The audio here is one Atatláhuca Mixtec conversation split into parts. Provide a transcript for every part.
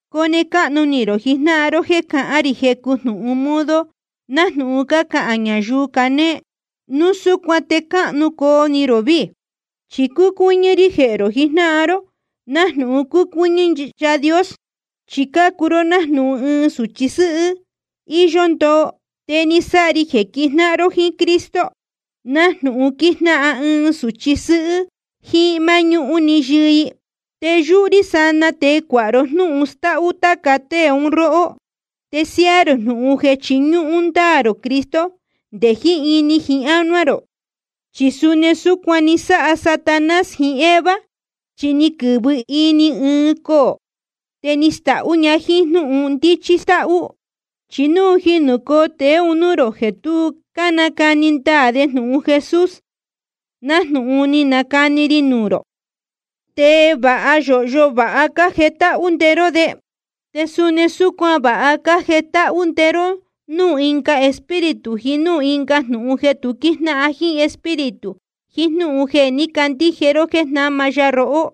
Cone cáhnu ni rō jijnáhan ró jeē cahán rī jecu jnūhun modo nájnūhun cácahān ñayuu canéé. Núu súcuan te cáhnu coo ni rō víī. Chi cúcuɨ́ñɨ́ rí jehē rō jijnáhan ró, nájnūhun cúcuɨ́ñɨ́ Yaā Dios. Chi cácuu ró nájnūhun ɨɨn sūchi sɨ́hɨ́ íyó ndoo, te ni sáha ri jeē quijnáhan ró jíín Cristo, nájnūhun quíjnáhan ɨɨn sūchi sɨ́hɨ́ jíín máñúhún‑ni yɨɨ i. Te yúhú rí sanaa te cuāha ro jnúhun stáhú táca tée un róhó, te siáá rō jnūhun jeē chiñúhún ndáā rō Cristo nde jiín ini jiín ánuá rō. Chi suni súcuan ni sáha Satanás jiín Eva, chi ni quɨ̄vɨ ini ɨɨn coō, te ni stahú un ña jíín jnúhun ndíchí stáhú. Chi núu quíjicoo tēe nuū rō jeē tu cánacani ndaā de jnūhun Jesús nájnūhun ni canacani ri nuū rō, te va yōhyo vāha cájetáhú nde ró de. Te suni súcuan vāha cájetáhú nde ró núū ɨnga espíritu jiín núū ɨnga jnūhun jeē tu quíjnáhan jíín Espíritu jiín jnúhun jeē ní cacandíje ró jéē jnáma ya rohó.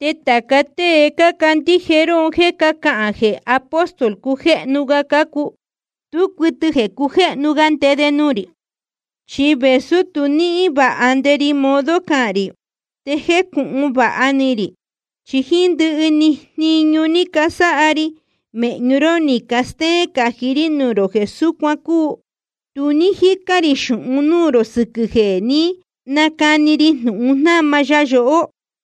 Te tāca tée cácandíje ró un jéē cácahān jeē apóstol cujéhnu ga cácuu, tú cuɨtɨ jeē cujéhnu ga nde de nuū rī. Chi vēsú tu níhín vāha nde ri modo cahān rī, te jécūhun vāha ni rī. Chi jíín ndɨhɨ jniñu ni casáha ri mēhñu ró ni castéén cají rí nuū rō jeē súcuan cúu. Tu ní jícán rī xūhun núū rō sɨquɨ̄ jeē ní nacani ri jnūhun jnáma ya yohó.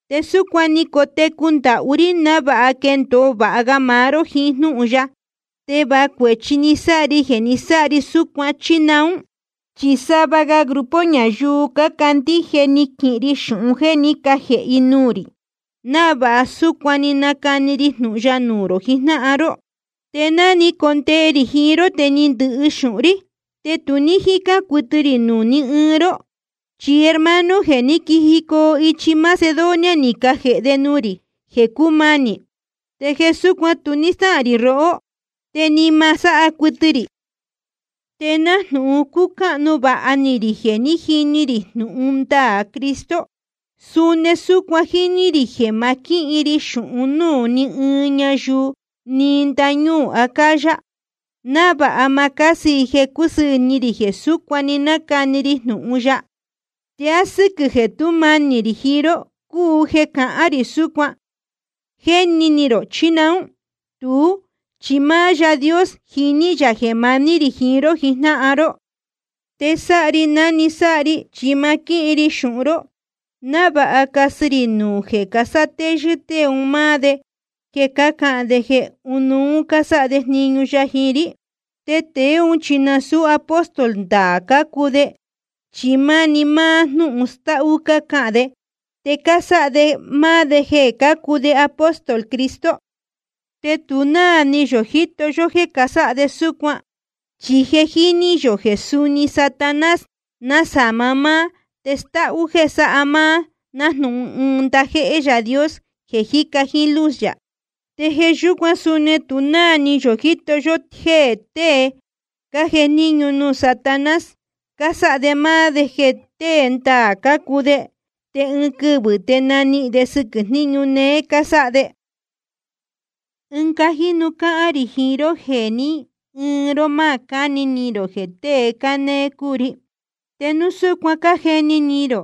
Te súcuan ni cotecu ndahú rí návāha quendōo vāha ga maá ró jiín jnúhun ya. ¿Te va cuēchi ni sáha ri jeē ni sáha ri súcuan, chí naún? Chi sava ga grupo ñayuu cácandíje ni quihin ri xūhun jéē ní cajēhe i nuū rī, návāha súcuan‑ni nacani ri jnūhun ya nuū rō jijnáhan ró. Te ná ni condee rī jiín ró te ni ndɨhɨ xūhun rí, te tu ní jícán cuɨtɨ rī nuū ní ɨɨn ró. Chi hermano jeē ní quijicoo ichi Macedonia ni cajēhe de nuū rī jeē cúmanī. Te jeē súcuan tu ní stáhān rī rohó, te ni ma sáha cuɨtɨ rī. Te nájnūhun cúcáhnu vāha ni rī jeē jiní rī jnūhun ndaā Cristo, suni súcuan jíní rī jeē ma quíhin ri xūhún nuū ni ɨɨn ñayuu nɨɨ́ ndáñúū Acaya, návāha ma cásɨ i jeē cúsɨɨ̄ ni rī jeē súcuan‑ni nácani ri jnūhun ya. ¿Te á sɨ́quɨ̄ jeē tú manī rī jiín ró cúu jeē cahán rī súcuan, jéni ni rō, chí naún? Tuú chi máá Yaā Dios jiní yā jeē maní rī jiín ró jijnáhan ró. Te sáha ri ná‑ni sáha ri, chi ma quíhin ri xūhun ró, návāha casɨ rī nuū jeē casátéyɨ́ tée un máá de jeē cácahān de jeē ɨnuú cásáha de jniñu ya jiín rí. Te tēe ún chi nasūú apóstol ndaā cácuu de, chi máni máá jnúhun stáhú cácahān de, te cásáha de máá de jeē cácuu de apóstol Cristo. Te tu náā ni yō jíto yó jéē casáha de súcuan, chi je jíní yō jeē suni Satanás násama máá te stáhú jéē sáha máá nájnūhun ɨɨn ndajéhé Yaā Dios jeē jíca jíín luz yā. Te jeē yúcuan suni tu náā ni yō jíto yó jéē tée cájejníñu nuū Satanás, cásáha de máá de jeē tée ndaā cácuu de. Te ɨɨn quɨvɨ̄ te nanihīn de sɨquɨ̄ jniñu néé cásáha de. Ɨnga jínu cáhán rī jiín ró jeē ni ɨɨn ró ma cáni ni rō jeē tée cánéé cúu ri. Te núu súcuan cájeni ni rō,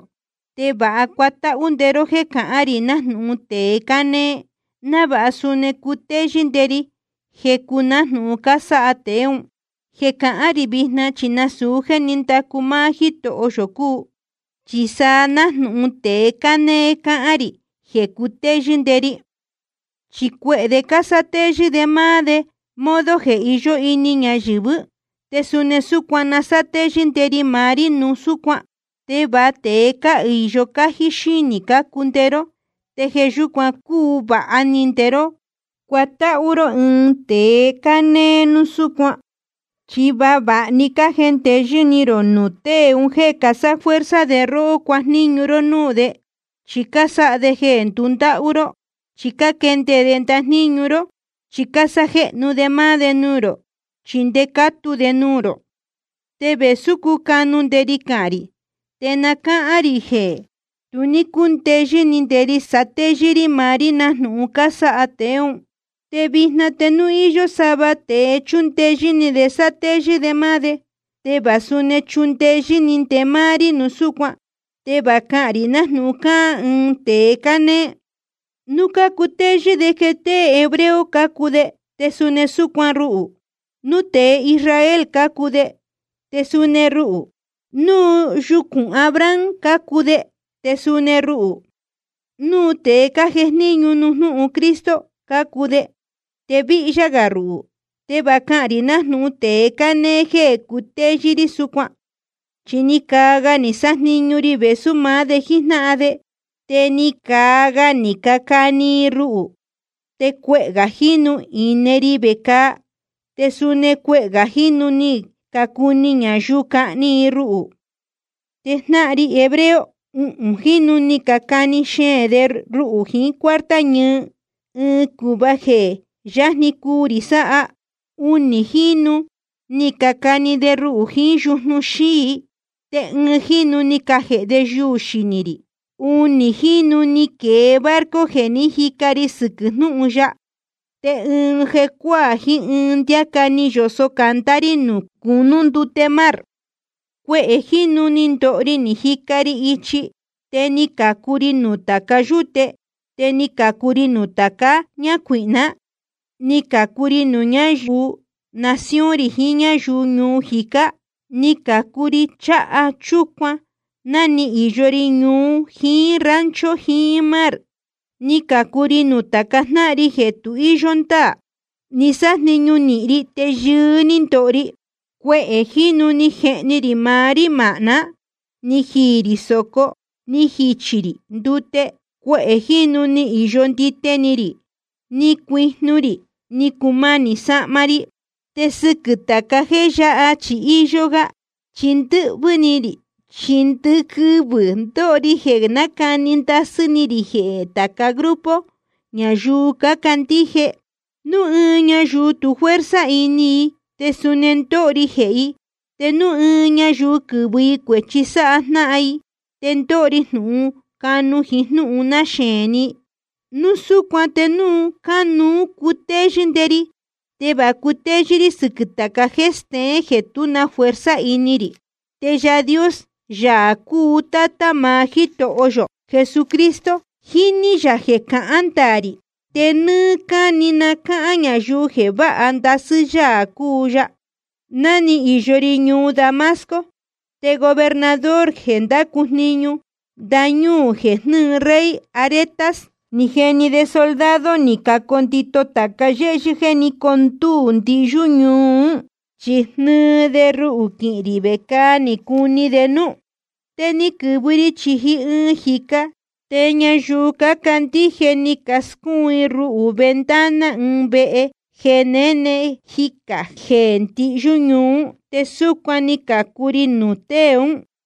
te va cuatáhú nde ró jéē cahán rī nájnūhun tēe cánéé, návāha suni cuu cutéyɨ́ nde ri jecu nájnūhun cásáha tēe ún. Jeē cahán rī vijna chi nasūu jéē ní ndacu máá Jítoho yō cúu, chi sa nájnūhun tēe cánéé cáhán rī jeē cutéyɨ́ nde ri. Chi cuehē de cásátéyɨ́ de máá de modo jeē iyó ini ñayɨ̄vɨ́, te suni súcuan na sátéyɨ́ nde ri maá rí núu súcuan. Te va tēe cáhīyo cájí xínī cácuu nde ró, te jeē yúcuan cúu vāha ni nde ró cuatáhú ró ɨɨn tēe cánéé núu súcuan. Chi va vāha‑ni cájendeyɨ́ ni rō nuū tée un jéē casáfuerza de róhó cuajníñu ró núū de, chí cásáha de jeē ndundáhú ró, chí cáquende de ndajníñu ró, chí cásájéhnu de máá de nuū rō, chí ndé cácatu de nuū rō. Te vēsú cúcanu nde ri cahān rī, te na cáhán rī jeē tu ní cúndeyɨ́ ni nde ri satéyɨ́ rí maá rí nájnūhun casáha tēe ún. Te vijna te núu íyó sava tēe chúndeyɨ́ ni de sátéyɨ́ de máá de, te va suni chundeyɨ́ ni nde máá rí núu súcuan. Te va cáhán rī nájnūhun cáhán ɨɨn tēe cánéé. Núu cácutéyɨ́ de jeē tée hebreo cácuu de, te suni súcuan ruhū. Núu tēe Israel cácuu de, te suni ruhū. Núu yucūn Abraham cácuu de, te suni ruhū. Núu tēe cájejníñu nuū jnúhun Cristo cácuu de, te víhyá gā ruhū. Te va cáhán rī nájnūhun tēe cánéé jéē cutéyɨ́ rí súcuan. Chi ni caa ga ni sájniñu ri vēsú maá de jíjnáhan de, te ni caa ga ni cacani i ruhū, te cuehē gā jínu ni ine ri vecāa, te suni cuehē gā jínu ni cacuni ñayuu cahni i ruhū. Te jnáhan ri hebreo, uhūn jínu ni cacani xeēn de ruhū jiín cuarta ñɨɨ, ɨɨn cūhva jeē jé yajni cuu rī sáha. Unī jínu ni cacani de ruhū jiín yujnu xíi, te ɨɨn jínu ni cajēhe de yuū xinī rī. Unī jínu ni quēe barco jeē ní jica ri sɨquɨ̄ jnúhun ya. Te ɨɨn jecuáā jiín ɨɨn ndiáca ni yosō candá rí nuū cunú ndute mar. Cuehē jínu ni ndoho ri ni jica ri ichi, te ni cācu ri nuū táca yúte, te ni cācu ri nuū táca ñácuīhná. Ni cācu ri nuū ñáyuu nación rī jiín núū ñáyuu ñuu jícá. Ni cācu ri cháha chúcuan ná ni īyo ri ñuu jiín rancho jiín mar. Ni cācu ri nuū tāca jnáhan ri jeē tu íyó ndáā. Ni sájniñu nīhin ri te yɨɨ́ ní ndoho ri. Cuehē jínu ni jehni rī maá rí māhná. Ni jiī rī sōco, ni jichī rī ndute. Cuehē jínu ni īyo ndite ni rī, ni cuijnu rī, ni cumanī sahma ri Te sɨquɨ̄ tāca jéē yáha chi íyó gá. Chi ndɨquɨvɨ̄ ndóho ri jeē nácani ndasɨ́ ni rī jehē tāca grupo ñayuu cácandíje. Núu ɨɨn ñayuu tu fuerza ini i, te suni ndóho ri jehē i. Te núu ɨɨn ñayuu quɨ́vɨ i cuēchi sáha jnáhan i, te ndóho ri jnūhun cúcanu jiín jnúhun náxeēn ni. Núu súcuan te núu cánuú cutéyɨ́ nde ri, te va cutéyɨ́ rí sɨquɨ̄ tāca jéē steén jeē tú na fuerza ini rī. Te Yaā Dios, Yaā cúu Tátá maá Jítoho yō Jesucristo, jíní yā jeē cahán ndaā rī. Te nɨ́ɨ́ cáni na cáhán ñayuu jeē vāha ndasɨ́ Yaā cúu ya. Ná ni īyo ri ñuu Damasco, te gobernador jeē ndácu jniñu ndañúū jeē jnɨ́ɨ rey Aretas, ni jeni de soldado ni cacondito tāca yéhyɨ́ jeē ní condúū ndihyú ñuu ún, chi jnɨɨ de ruhū quihīn rī vecāa ni cuni de núú. Te ni quɨ̄vɨ ri chīji ɨɨn jīca, te ñayuu cácandíje ni cascúun i ruhū ventana ɨɨn vehe jeē néne jicā jeē ndihyú ñuu ún. Te súcuan ni cācu ri nuū tée ún.